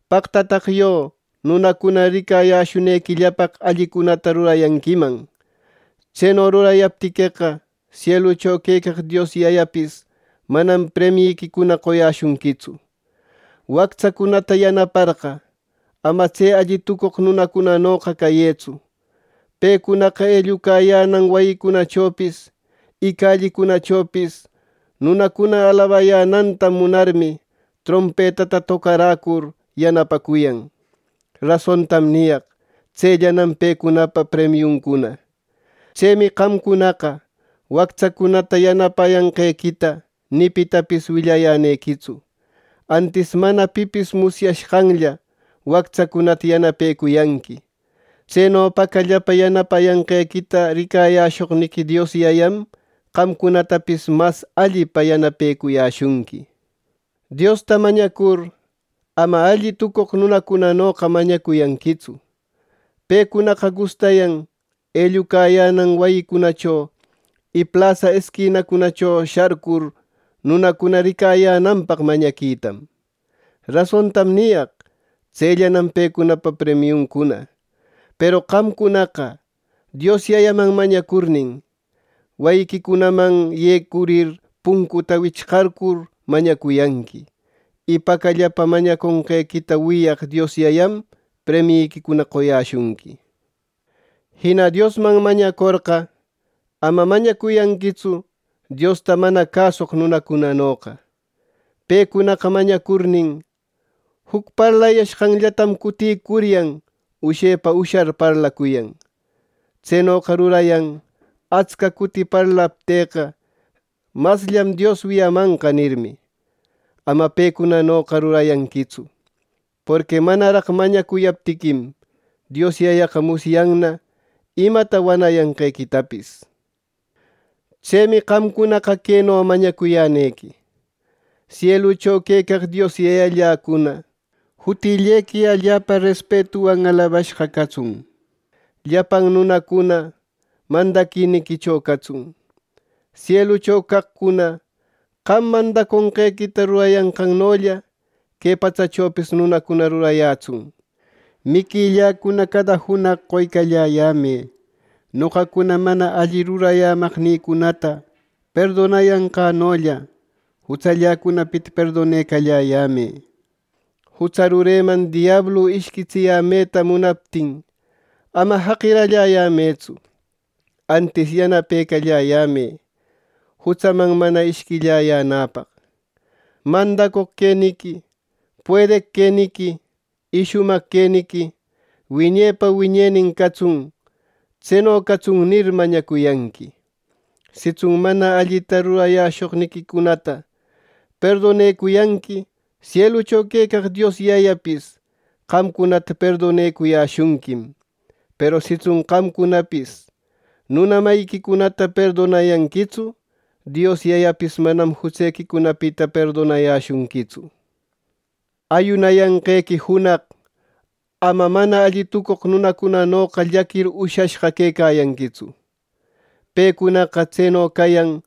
“¡Paqtataq yo nunacuna ricayäshunequillapaq allicunata rurayanquiman! Tseno rurayaptiqueqa, sielucho quecaq Dios Yayapis manam premiyiquicuna qoyäshunquitsu. “Wactsacunata yanaparqa, ama tse alli tucoq nunacunanoqa cayëtsu. Pecunaqa ellucayänan wayicunachopis, y callicunachopis nunacuna alabayänanta munarmi, trompetata tocaräcur yanapacuyan. Rasontam niyaq: Tsellanam pecunapa premiuncuna. Tsemi qamcunaqa wactsacunata yanapayanqequita ni pitapis willayänequitsu. Antis mana pipis musyashqanlla wactsacunata yanapecuyanqui. Tseno pacallapa yanapayanquequita ricashoqniqui Dios Yayam, qamcunatapis mas allipa yanapecuyäshunqui. “Diosta mañacur, ama alli tucoq nunacunanoqa mañacuyanquitsu. Pecunaqa gustayan ellucayänan wayicunacho, y plasa isquinacunacho sharcur, nunacuna ricayänanpaq mañaquitam. Rasontam niyaq: Tsellanam pecunapa premiuncuna. Peru qamcunaqa Dios Yayaman mañacurnin, wayiquicunaman yecurir puncuta wichqarcur mañacuyanqui. Y pacallapa mañaconqequita wiyaq Dios Yayam premiquicuna qoyäshunqui. “Jina Diosman mañacorqa, ama mañacuyanquitsu Diosta mana cäsucoq nunacunanoqa. Pecunaqa mañacurnin, juc parlayashqanllatam cutïcuryan ushepa ushar parlacuyan. Tsenoqa rurayan ‘Atsca cuti parlaptïqa, masllam Dios wiyamanqa’ nirmi. Ama pecunanoqa rurayanquitsu. Porqui manaraq mañacuyaptiquim, Dios Yayaqa musyanna imata wanayanqequitapis. Tsemi qamcunaqa queno mañacuyänequi: Sielucho quecaq Dios Yayalläcuna, jutillequi allapa respetuwan alabashqa catsun. Llapan nunacuna mandadiquicho catsun. ¡Sielucho caqcuna qam mandaconqequita rurayanqannolla, que patsachopis nunacuna rurayätsun! Miquilläcuna cada junaq qoycalläyämë. Noqacuna mana alli rurayämaqnïcunata perdonayanqänollä, jutsalläcunapita perdonecalläyämë. Jutsa rureman diablu ishquitsiyämeta munaptin ama jaqiralläyämëtsu; antis yanapecalläyämë jutsaman mana ishquilläyänäpaq. ˻¡Mandacoq queniqui, puedeq queniqui y shumaq queniqui wiñepa wiñenin catsun!˼ Tseno catsun, nir, mañacuyanqui. “Sitsun mana allita rurayäshoqniquicunata perdonecuyanqui, sielucho quecaq Dios Yayapis qamcunata perdonecuyäshunquim. Peru sitsun qamcunapis nuna mayiquicunata perdonayanquitsu, Dios Yayapis manam jutsequicunapita perdonayäshunquitsu. “Ayunayanqequi junaq ama alli tucoq nunacunanoqa llaquir ushashqa quecayanquitsu. Pecunaqa tseno cayan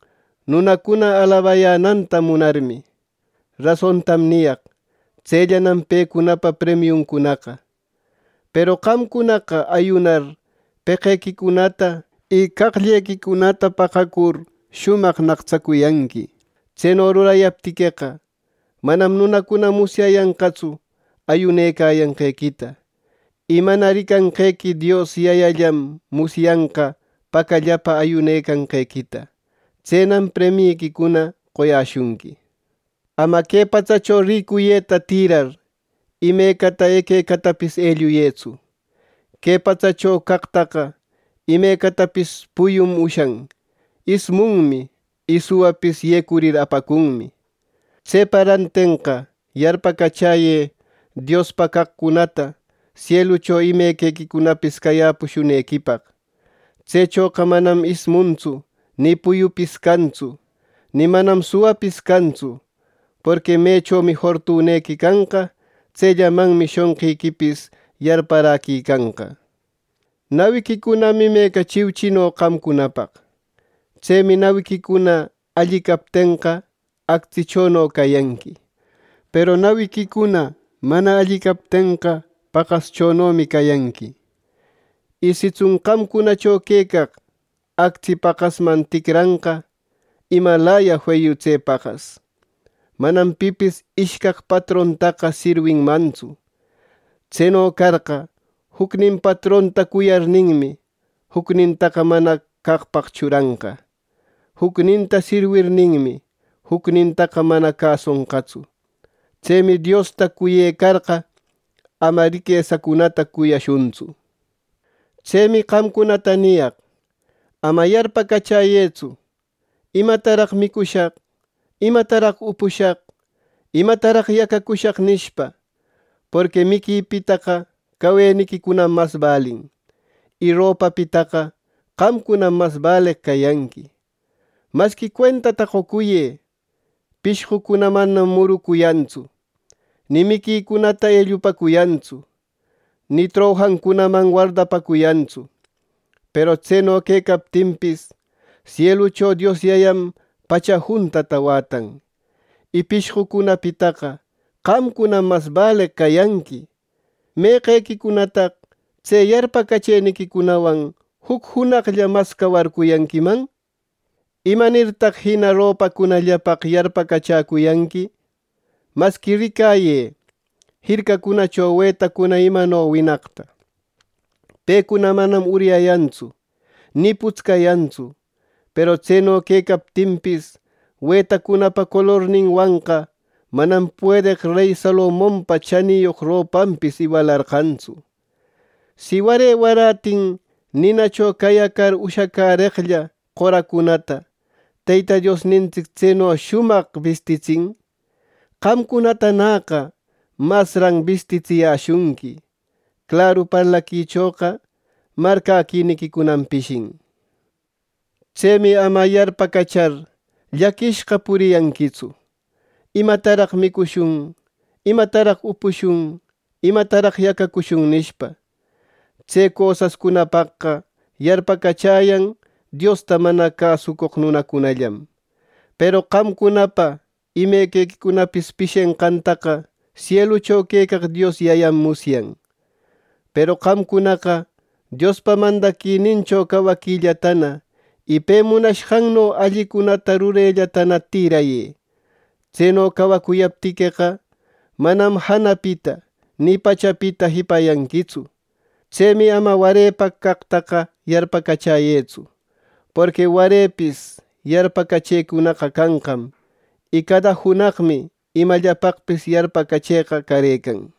nunacuna alabayänanta munarmi. Rasontam niyaq: Tsellanam pecunapa premiuncunaqa. Peru qamcunaqa ayunacur peqequicunata y qaqllequicunata paqacur shumaq naqtsacuyanqui. Tseno rurayaptiqueqa, manam nunacuna musyayanqatsu ayunecayanqequita; y mana ricanqequi Dios Yayallam musyanqa pacallapa ayunecayanqequita. Tsenam premiyiquicuna qoyäshunqui. “Ama que patsacho ricuyeta tirar, imecata equecatapis elluyëtsu. Que patsacho caqtaqa imecatapis puyum ushan, ismunmi y suwapis yecurir apacunmi. Tsepa rantenqa yarpacachäyë Diospa caqcunata sielucho imequequipis cayäpushunequipaq. Tsechoqa manam ismuntsu ni puyupis cantsu; ni manam suwapis cantsu. Porqui mechomi fortunequi canqa, tsellamanmi shonqiquipis yarparäquicanqa. “Nawiquicunam imeca chiuchino qamcunapaq. Tsemi nawiquicuna alli captenqa, actsichono cayanqui; Peru nawintsic mana alli captenqa, paqaschonomi cayanqui. Y sitsun qamcunacho quecaq actsi paqasman ticranqa, ¡imalaya feyu tse paqas! “Manam pipis ishcaq patrontaqa sirwinmantsu. Tseno carqa, jucnin patronta cuyarninmi, jucnintaqa mana caqpaq churanqa; jucninta sirwirninmi, jucnintaqa mana cäsonqatsu. Tsemi Diosta cuyecarqa, ama riquesacunata cuyashuntsu. “Tsemi qamcunata niyaq: Ama yarpacachäyëtsu, ‘¿Imataraq micushaq? ¿Imataraq upushaq? ¿Imataraq yacacushaq?’ nishpa. Porqui miquipitaqa caweniquicunam mas balin, y ropapitaqa qamcunam mas baleq cayanqui. Masqui cuentata qocuyë: Pishqucuna manam murucuyantsu, ni miquicunata ellupäcuyantsu, ni trojancunaman wardapäcuyantsu. Peru tseno quecaptinpis, sielucho Dios Yayam pacha juntata wätan, y pishqucunapitaqa qamcunam mas baleq cayanqui. ¿Meqequicunataq tse yarpacachëniquicunawan juc junaqlla mas cawarcuyanquiman! “¿Imanirtaq jina ropacunallapaq yarpacachäcuyanqui! Masqui ricayë jircacunacho wetacuna imano winaqta. Pecuna manam uryayantsu ni putscayantsu. Peru tseno quecaptinpis, wetacunapa colorninwanqa manam puedeq rey Salomonpa chaniyoq ropanpis iwalarqantsu. Si ware waratin ninacho cayacar ushacäreqlla qoracunata Teyta Diosnintsic tseno shumaq bistitsin, qamcunatanäqa masran bistitsiyäshunqui. ¡Claru parlaquichoqa marcäquiniquicunam pishin! Tsemi ama yarpacachar llaquinashqa puriyanquitsu, ‘¿Imataraq micushun? ¿Imataraq upushun? ¿Imataraq yacacushun?’ nishpa. Tse cosascunapaqqa yarpacachäyan Diosta mana cäsucoq nunacunallam. Peru qamcunapa imequicunapis pishenqantaqa sielucho quecaq Dios Yayam musyan. Peru qamcunaqa Diospa mandaquinincho cawaquillatana, y pe munashqanno allicunata rurellatana tirayë. Tseno cawacuyaptiqueqa, manam janapita, ni pachapita jipayanquitsu. Tsemi ama warepaq caqtaqa yarpacachäyëtsu. Porqui warepis yarpacachecunaqa canqam, y cada junaqmi imallapaqpis yarpacachëqa carëcan.